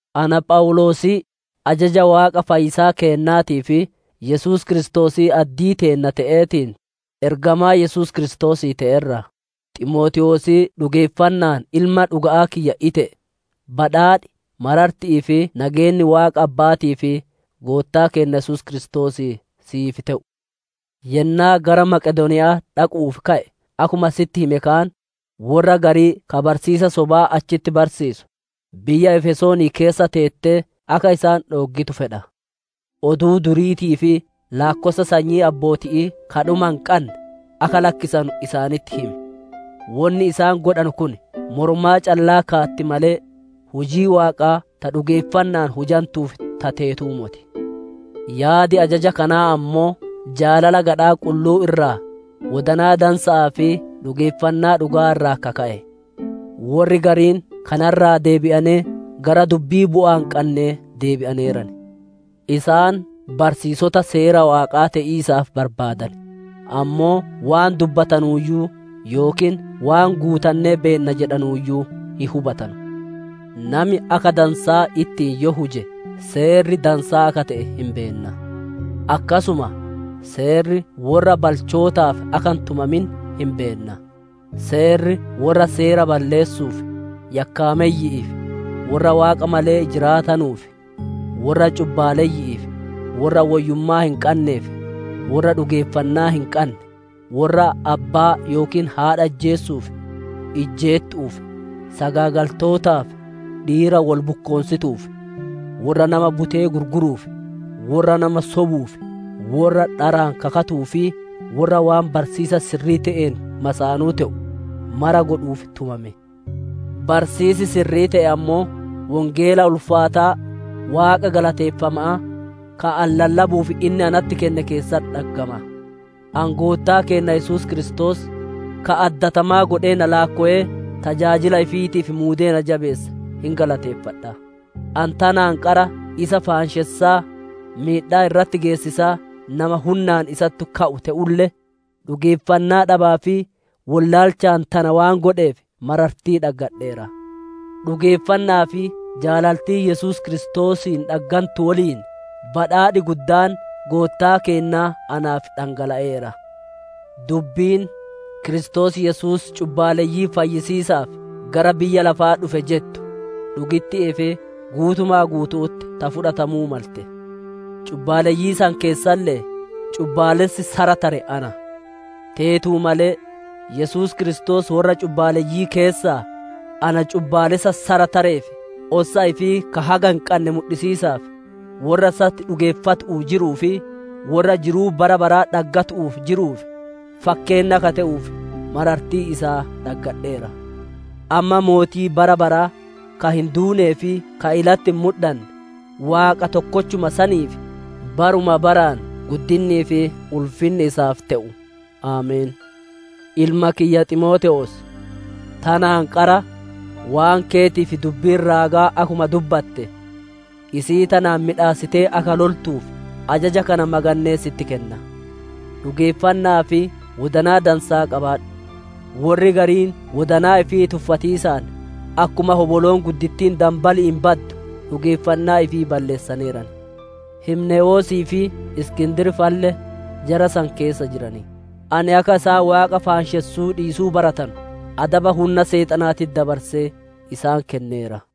Ana Phawuloosii, ajaja Waaqa fayyisaa keennaatii fi Yesuus Kiristoosii addii teenna te'eetiin, ergamaa Yesuus Kiristoosii te'e irraa, Ximootewoosii dhugeeffanna'aan ilma dhuga'aa kiyya ite'e: Badhaadhi, mararti'ii fi nageenni Waaqa Abba'aatii fi Goottaa keenna Kiristoosii siif te'u. Yennaa gara Maqedooniya'aa dhaqu'uuf ka'e akkuma sitti hime kaan, worra garii ka barsiisa sobaa achitti barsiisu, biyya Efesoonii keessa teettee akka isaan dhooggitu fedha. Oduu duriitii fi laakkossa sanyii abbooti'ii ka dhuma hin qanne, akka lakkisanu isaanitti himi. Wonni isaan godhanu kun moromaa callaa kaatti malee, hujii Waaqaa ta dhugeeffanna'aan hujantuuf ta teetuu moti. Yaadi ajaja kanaa ammoo jaalala gadhaa qulluu irraa, wodanaa dansa'aa fi dhugeeffannaa dhuga'aa irraa ka ka'e. Worri gariin kana irraa deebi'anee gara dubbii bu'aa hin qannee deebi'aneeran. Isaan barsiisota seera Waaqaa te'iisaaf barbaadan, ammoo waan dubbatanuuyyuu yookiin waan guutannee beenna jedhanuuyyuu hin hubatanu. Nami akka dansaa ittiin yoo huje seerri dansaa akka te'e hin beenna. Akkasuma seerri worra balchootaaf akka hin tumamin hin beenna; seerri worra seera balleessuuf, yakkaameyyi'iif, worra Waaqa malee jiraatanuuf, worra cubbaaleyyi'iif, worra woyyummaa hin qanneef, worra dhugeeffannaa hin qanne, worra abbaa yookiin haadha ijjeesuuf, ijjeettu'uuf, sagaagaltootaaf, dhiira wol bukkoonsituuf, worra nama butee gurguruuf, worra nama sobuuf, worra dharaan kakatuu fi worra waan barsiisa sirrii te'een masaanuu te'u mara godhuuf tumame. Barsiisi sirrii te'e ammoo Wongeela ulfaataa Waaqa galateeffama'aa, ka ani lallabuuf inni natti kenne keessatti dhaggama. Ani Goottaa keenna Yesuus Kiristoos, ka addatamaa godhee na laakkowee tajaajila ifiitiif muudee na jabeesse hin galateeffadha. Ani tanaan qara isa faanshessaa, miidhaa irratti geessisaa nama hunnaan isatti ka'u te'ulle, dhugeeffannaa dhabaa fi wollaalchaan tana waan godheef marartii dhaggadheera. Dhugeeffanna'aa fi jaalaltii Yesuus Kiristoosiin dhaggantu woliin badhaadhi guddaan Goottaa keennaa naaf dhangala'eera. Dubbiin, «Kiristoos Yesuus cubbaaleyyii fayyisiisaaf gara biyya lafaa dhufe» jettu dhugitti'ii fi guutuma guutu'utti ta fudhatamuu malte. Cubbaaleyyii san keessaalle'ee, cubbaalessi sara tare ana. Teetu malee, Yesuus Kiristoos worra cubbaaleyyii keessaa, na cubbaalessa sara tareef ossa ifii ka haga hin qanne mudhisiisaaf, worra isatti dhugeeffatu'uu jiruu fi worra jiruu bara baraa dhaggatu'uu jiruuf, fakkeenna akka te'uuf marartii isaa dhaggadheera. Amma mootii bara baraa, ka hin duunee fi ka ilatti hin mudhanne, Waaqa tokkochuma saniif, baruma baraan guddinnii fi ulfinni isaaf te'u! Ameen. Ilma kiyya, Ximootewoos, tanaan qara waan keetiif dubbiin raagaa akkuma dubbatte, isii tanaan miidhassitee akka loltuuf ajaja kana magannee sitti kenna. Dhugeeffanna'aa fi wodanaa dansaa qabaadhu. Worri gariin wodanaa ifii tuffatiisaan, akkuma hoboloon guddittiin danbali'iin baddu dhugeeffannaa ifii balleessaneeran. Himnewoosii fi Iskindir fa'alle, jara san keessa jiran; ani akka isaan Waaqa faanshessuu dhiisuu baratanu adaba hunna Seexanaatitti dabarsee isaan kenneera.